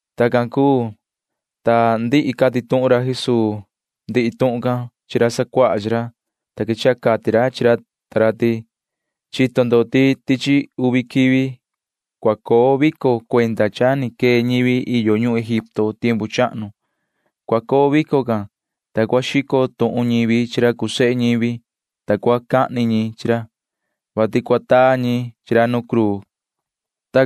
Tacan cuu, ta cha ndihi cati tuhun ra Jesuu ndihi tuhun can chi ra sacuaha chi ra, ta quechaha cati ra chi ra ta ra ti: ―Chito ndo ti tichi uvi quivi cua coo vico cuenda cha ni quee ñivi yo ñuhun Egipto tiempu chahnu. Cua coo vico can, ta cua xico tuhun ñivi chi ra cuu sehe ñivi, ta cua cahni ñi chi ra, vati cua taa ñi chi ra nu cruu ―cati ra chi ra.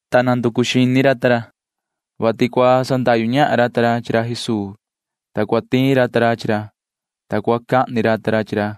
ta nanducu xini ra ta ra, vati cua sandahyu ñahan ra ta ra chi ra Jesuu, ta cua tiin ra ta ra chi ra, ta cua cahni ra ta ra chi ra,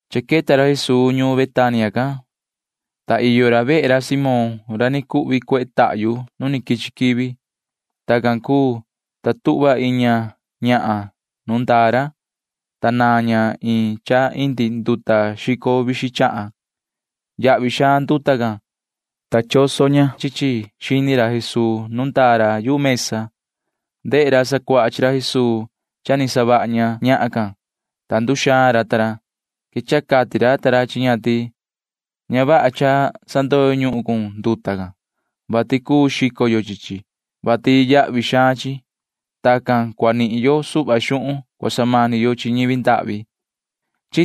Cha queta ra Jesuu ñuun Betania can, ta iyo ra vehe ra Simón ra ni cuhvi cuehe tahyu nu quichi quivi. Tacan cuu, ta tuhva iin ñahan nuun ndaa ra, ta naan ña iin cha indi nduta xico vixin chahan. Yahvi xaan nduta can, ta choso ña chi chi xini ra Jesuu nu ndaa ra yu mesa. Ndehe ra sacuaha chi ra Jesuu cha ni savaha ña ñahan can, ta nduxaan ra ta ra. Quechaha cati ra ta ra chi ña ti: ―Ña vaha cha sandoyo ñuhun cun nduta can, vati cuu xico yo chi chi, vati yahvi xaan chi. Tacan cua nihin yo suhva xuhun cua samani yo chi ñivi ndahvi ―cati ra chi ña.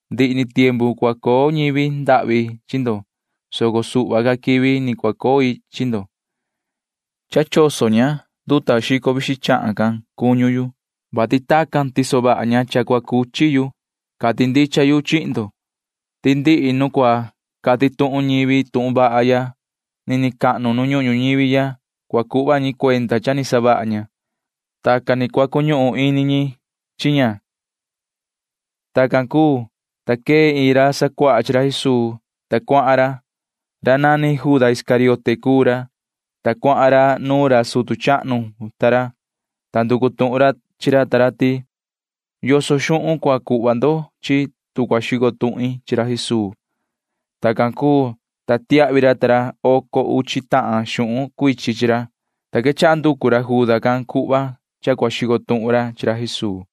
Ndihi ni tiempu cua coo ñivi ndahvi chi ndo, soco suhva ca quivi ni cua coi chi ndo. Cha choso ña nduta xico vixin chahan can cuñu yu, vati tacan tiso vaha ña cha cua cuchi yu. Cati ndicha yu chihin ndo ti ndihi nu cua cati tuhun ñivi tuhun vaha ya nini cahnu nu ñuhun ñuñivi ya cua cuhva ñi cuenda cha ni savaha ña. Tacan ni cua cuñuhun ini ñi chi ña ―cati ra Jesuu. Tacan cuu, ta quee iin ra sacuaha chi ra Jesuu, ta cuahan ra. Ra nani Juda Iscariote cuu ra, ta cuahan ra nuun ra sutu chahnu ta ra, ta nducu tuhun ra chi ra ta ra ti: ―¿Yoso xuhun cua cuhva ndo chihin yu, ta cua xico tuhin chi ra Jesuu? ―cati ra. Tacan cuu, ta tiahvi ra ta ra oco uchi tahan xuhun cuichin chi ra, ta nda hora can nducu ra Juda can cuhva cha cua xico tuhun ra chi ra Jesuu.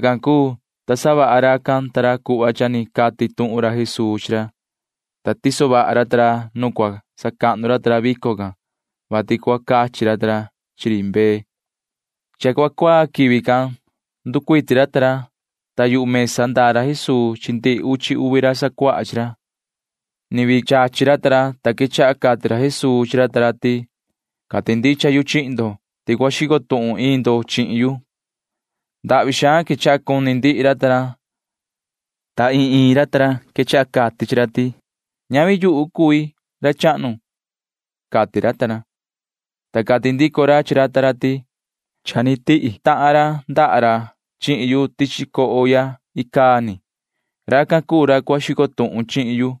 Tacan cuu, ta savaha racan ta ra cuhva cha ni cati tuhun ra Jesuu chi ra, ta tiso vaha ra ta ra nu cua sacahnu ra ta ra vico can, vati cua cachi ra ta ra chi ri mbee. Cha cuaa quivi can [nducuiti ra ta ra], ta yu mesa ndaa ra Jesuu chi ndihi uchi uvi ra sacuaha chi ra. Ni vii chachi ra ta ra, ta quechaha cati ra Jesuu chi ra ta ra ti: ―Cati ndicha yu chihin ndo ti cua xico tuhun iin ndo chihin yu ―cati ra. Ndahvi xaan quechaha cuni ndihi ra ta ra, ta ta iin ta iin ra quechaha cati chi ra ti: ―Ñavi yuhu cui, ra chahnu ―cati ra ta ra. Ta cati ndico ra chi ra ta ra ti: ―Cha ni tihi tahan ra ndaha ra chihin yu tichi coho ya icaa ni. Racan cuu ra cua xico tuhun chihin yu.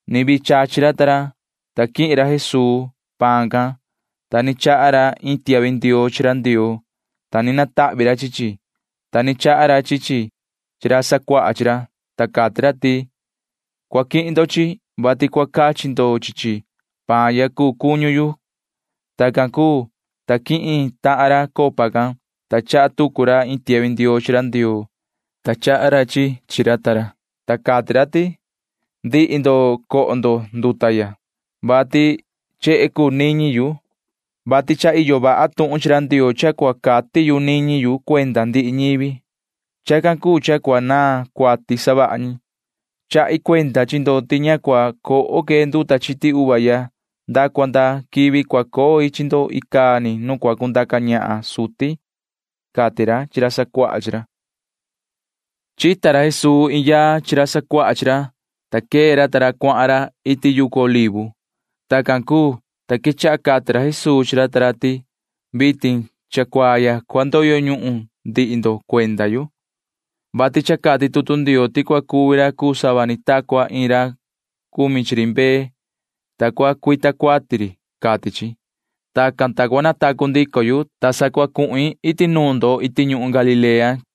Ni vii chachi ra ta ra, ta quihin ra Jesuu paan can, ta ni chaha ra iin tiahvi ndioo chi ra Ndioo, ta ni natahvi ra chi chi, ta ni chaha ra chi chi chi ra sacuaha chi ra, ta cati ra ti: ―Cua quihin ndo chi chi, vati cua cachi ndo chi chi. Paan ya cuu cuñu yu ―cati ra. Tacan cuu, ta quihin tahan ra copa can, ta chaha tucu ra iin tiahvi ndioo chi ra Ndioo, ta chaha ra chi chi chi ra ta ra, ta cati ra ti: ―Ndihi ndo cua coho ndo nduta ya, vati chehe cuu niñi yu, vati cha iyo vaha tuhun chi ra Ndioo cha cua cati yu niñi yu cuenda ndihi ñivi. Chacan cuu cha cua naan cuati savaha ñi. Chahi cuenda chi ndo ti ña cua coho que nduta chiti uva ya nda cua nda quivi cua coi chi ndo icaa ni nu cua cundaca ñahan suti ―cati ra chi ra sacuaha chi ra. Chita ra Jesuu iin yaa chi ra sacuaha chi ra, ta quee ra ta ra cuahan ra iti yucu Olivo. Tacan cuu, ta quechaha cati ra Jesuu chi ra ta ra ti: ―Vitin cha cuaa ya cua ndoyo ñuhun ndihi ndo cuenda yu, vati cha cati tutu Ndioo ti cua cuvi ra cuu sava ni ta cua iin ra cumi chi ri mbee, ta cua cuita cuati ri, cati chi. Tacan, ta cua natacu ndico yu, ta sa cua cuhin iti nuun ndo iti ñuhun Galilea ―cati ra Jesuu.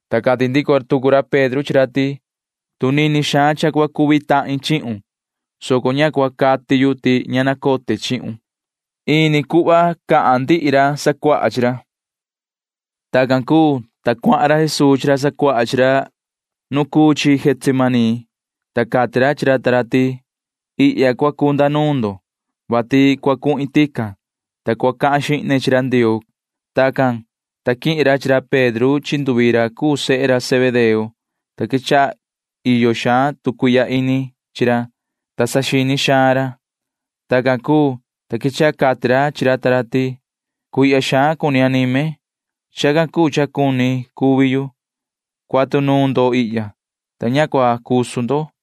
Ta cati ndico tucu ra Pedro chi ra ti: ―Tu nini xaan cha cua cuvi tahin chihun, soco ña cua cati yu ti ña nacote chihun ―cati racan. Ta ni cuhva cati ndihi ra sacuaha chi ra. Tacan cuu, ta cuahan ra Jesuu chi ra sacuaha chi ra nu Getsemaní, ta cati ra chi ra ta ra ti: ―Ihya cua cunda nuun ndo, vati cua cuhin tican, ta cua cahan xihne chi ra Ndioo ―cati ra. Tacan, ta quihin ra chi ra Pedro chi nduvi ra cuu sehe ra Zebedeo, ta quechaha iyo xaan tu cuihya ini chi ra, ta saxini xaan ra. Tacan cuu, ta quechaha cati ra chi ra ta ra ti: ―Cuihya xaan cuni anime. Chacan cuu cha cuni cuvi yu. Cuatu nuun ndo ihya, ta ña cua cusu ndo ―cati ra.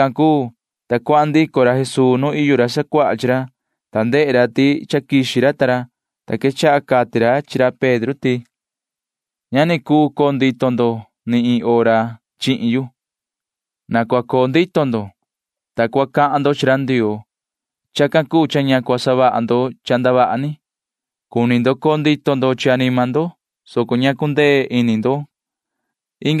Tacan cuu, ta cuahan ndico ra Jesuu nu iyo ra sacuaha chi ra, ta ndehe ra ti cha quixi ra ta ra, ta quechaha cati ra chi ra Pedro ti: ―Ña ni cuu coo ndito ndo ni iin hora ni chihin yu. Na cua coo ndito ndo, ta cua cahan ndo chi ra Ndioo. Chacan cuu cha ña cua savaha ndo cha ndavaha ni. Cuni ndo coo ndito ndo chi anima ndo, soco ña cundee ini ndo ―cati ra chi ra.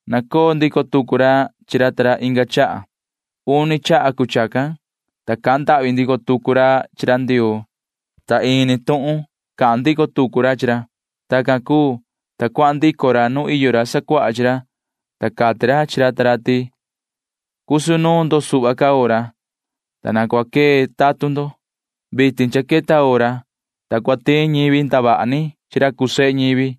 Nacoo ndico tucu ra chi ra ta ra inga chaha. Uni chaha cuu chacan, ta cahan ndahvi ndico tucu ra chi ra Ndioo, ta ini tuhun can cahan ndico tucu ra chi ra. Tacan cuu, ta cuahan ndico ra nu iyo ra sacuaha chi ra, ta cati ra chi ra ta ra ti: ―Cusu nuun ndo suhva ca hora, ta na cua quee tatun ndo. Vitin cha queta hora, ta cua tiin ñivi ndavaha ni chi ra cuu sehe ñivi.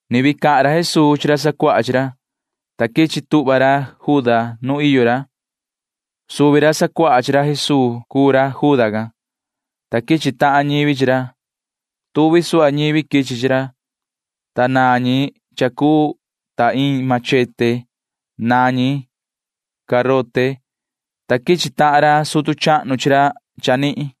Ni vii cahan ra Jesuu chi ra sacuaha chi ra, ta quichi tuhva ra Juda nu iyo ra. Suvi ra sacuaha chi ra Jesuu cuu ra Juda can, ta quichi tahan ñivi chi ra. Tuvi suhva ñivi quichi chi ra, ta naan ñi cha cuu ta iin machete. Naan ñi garote. Naan ñi, ta quichi tahan ra sutu chahnu chi ra chanihin.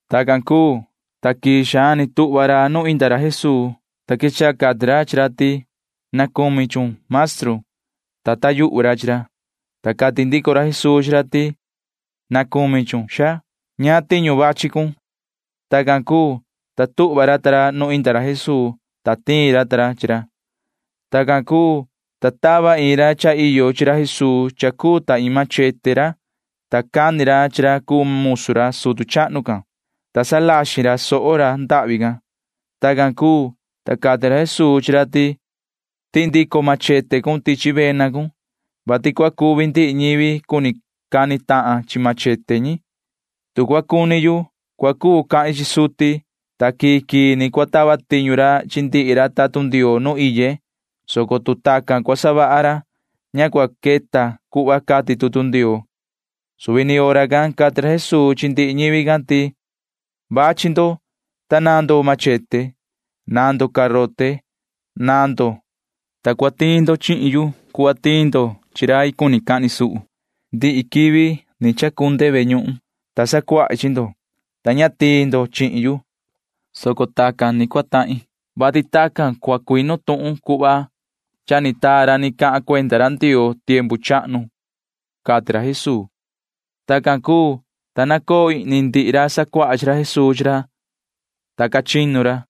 Tacan cuu, ta quii xaan ni tuhva ra nu inda ra Jesuu, ta quechaha cati ra chi ra ti: ―Na cumi chun, maestru ―cati ra. Ta taa yuhu ra chi ra, ta cati ndico ra Jesuu chi ra ti: ―Na cumi chun, xaa. ¿Ñaan tiñu vachi cun? ―cati ra. Tacan cuu, ta tuhva ra ta ra nu inda ra Jesuu, ta tiin ra ta ra chi ra. Tacan cuu, ta tava iin ra cha iyo chi ra Jesuu cha cuu ta iin machete ra, ta cani ra chi ra cuu musu ra sutu chahnu can, ta salaxin ra soho ra ndahvi can. Tacan cuu, ta cati ra Jesuu chi ra ti: ―Tihi ndico cun machete cun tichi vena cun, vati cua cuvi ndihi ñivi cuni cani tahan chi machete ñi. Tu cua cuni yu, cua cuu cahin chi suti, ta quii quii ni cua tava tiñu ra chi ndihi ra tatun Ndioo nu iye, soco tu tacan cua savaha ra, ña cua cuu queta cuhva cati tutu Ndioo ―cati ra. Suvi ni hora can cati ra Jesuu chi ndihi ñivi can ti: ―Vachi ndo, ta naan ndo machete. Naan ndo garote. Naan ndo, ta cua tiin ndo chihin yu cuhva tiin ndo chi rai cuni cahni suhu. Ndihi quivi ni chacunde ve ñuhun, ta sacuahi chi ndo, ta ña tiin ndo chihin yu, soco tacan ni cua tahin, vati tacan cua cuinu tuhun cuhva cha ni taa ra ni cahan cuenda ra Ndioo tiempu chahnu ―cati ra Jesuu. Tacan cuu, ta nacoo ihni ndihi ra sacuaha chi ra Jesuu chi ra, ta ca chinu ra.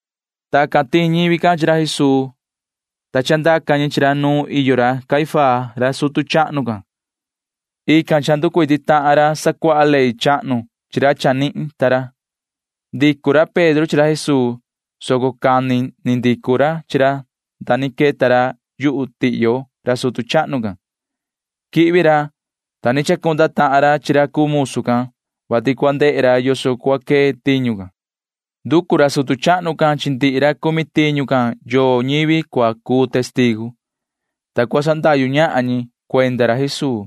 Tacan tiin ñivi can chi ra Jesuu, ta chandaca ñi chi ra nu iyo ra Caifás ra sutu chahnu can. Ican cha nducuiti tahan ra sacuaha ley chahnu chi ra chanihin ta ra. Ndicu ra Pedro chi ra Jesuu, soco cani vihi ndicu ra chi ra nda ni queta ra yu tihyo ra sutu chahnu can. Quihvi ra, ta ni chacunda tahan ra chi ra cuu musu can, vati cua ndehe ra yoso cua quee tiñu can. Nducu ra sutu chahnu can chi ndihi ra cumi tiñu can yoo ñivi cua cuu testigu, ta cua sandahyu ñahan ñi cuenda ra Jesuu,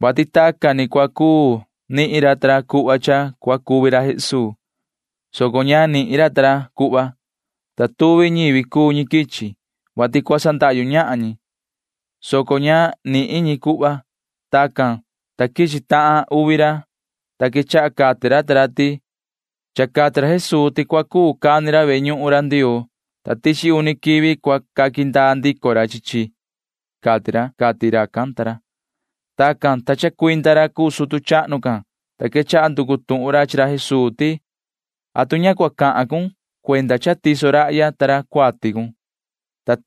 vati tacan ni cua cuu nihin ra ta ra cuhva cha cua cuvi ra Jesuu, soco ña nihin ra ta ra cuhva. Tuvi ñivi cuu ñi quichi, vati cua sandahyu ñahan ñi, soco ña ni nihin ñi cuhva. Tacan, ta quichi tahan uvi ra, ta quechaha cati ra ta ra ti: ―Cha cati ra Jesuu ti cua cuu cani ra ve ñuhun Ndioo ya, ta tichi uni quivi cua sandaa ndico ra chi chi, cati ra ―cati racan ta ra. Tacan, ta chacuinda ra cuu sutu chahnu can, ta quechaha nducu tuhun ra chi ra Jesuu ti: ―¿Atu ña cua cati ndico cun cha tiso rahya ta ra cuati cun? ―cati ra.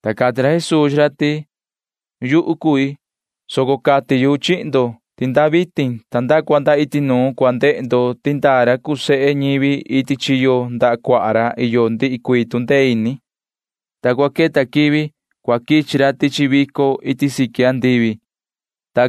Ta cati ra Jesuu chi ra ti: ―Yuhu cui, soco cati yu chihin ndo ti nda vitin ta nda cua nda iti nuun cua ndehe ndo ti ndaa ra cuu sehe ñivi iti chiyo ndaha cuaha ra iyo ndihi cuii tu ndee ini, ta cua queta quivi cua quichi ra tichi vico iti siqui andivi ―cati ra chi ra.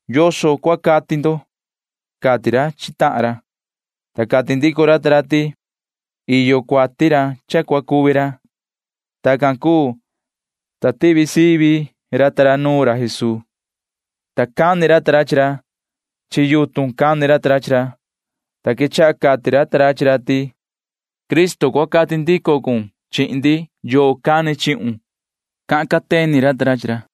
¿Yoso cua cati ndo? ―cati ra chi tahan ra. Ta cati ndico ra ta ra ti: ―Iyo cuati ra cha cua cuvi ra ―cati ra ta ra. Tacan cuu, ta tivi sivi ra ta ra nuun ra Jesuu, ta cani ra ta ra chi ra. Chi yutun cani ra ta ra chi ra, ta quechaha cati ra ta ra chi ra ti: ―Yoho Cristo, cua cati ndico cun chihin ndi. ¿Yoo cani chihun? ―cahan cateni ra ta ra chi ra.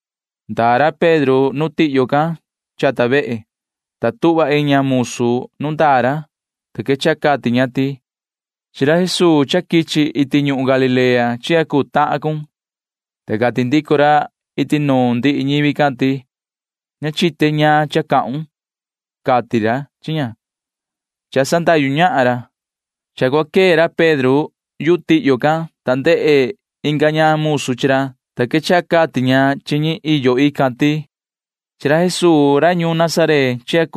Ndaa ra Pedro nu tihyo can chata vehe, ta tuhva iin ña musu nu ndaa ra, ta quechaha cati ña ti: ―Cha chica tahun chi ra Jesuu ra quichi iti ñuhun Galilea ―cati ña. Ta cati ndico ra iti nuun ndihi ñivi can ti: ―Ña chite ñaan cha cahun ―cati ra chi ña [cha sandahyu ñahan ra]. Cha cua quee ra Pedro yu tihyo can, ta ndehe inga ña musu chi ra, ta quechaha cati ña chi ñi iyo ican ti: ―Cha chica tahan rahya chi ra Jesuu ra ñuun Nazaret ―cati ña.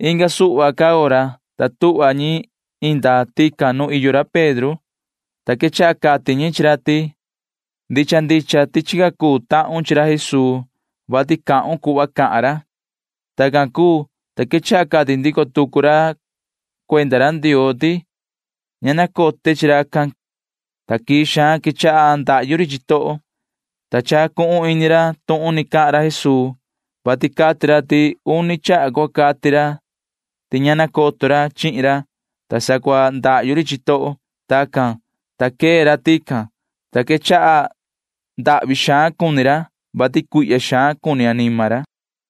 Inga suhva ca hora, ta tuhva ñi inda tican nu iyo ra Pedro, ta quechaha cati ñi chi ra ti: ―Ndicha ndicha ti chica tahun chi ra Jesuu, vati cahun cuhva cahan ra ―cati ñi. Tacan cuu, ta quechaha cahan rai ndico tucu ra cuenda ra Ndioo, ta cati ra ti: ―Ña nacote chi racan ―cati ra. Ta quii xaan quechaha ndahyu ri chitoho, ta chacuhun ini ra tuhun ni cahan ra Jesuu, vati cati ra ti uni hora cua cati ra ti ña nacoto ra chihin ra, ta sa cua ndahyu ri chitoho. Tacan, ta quee ra tican, ta quechaha ndahvi xaan cuni ra, vati cuihya xaan cuni anima ra.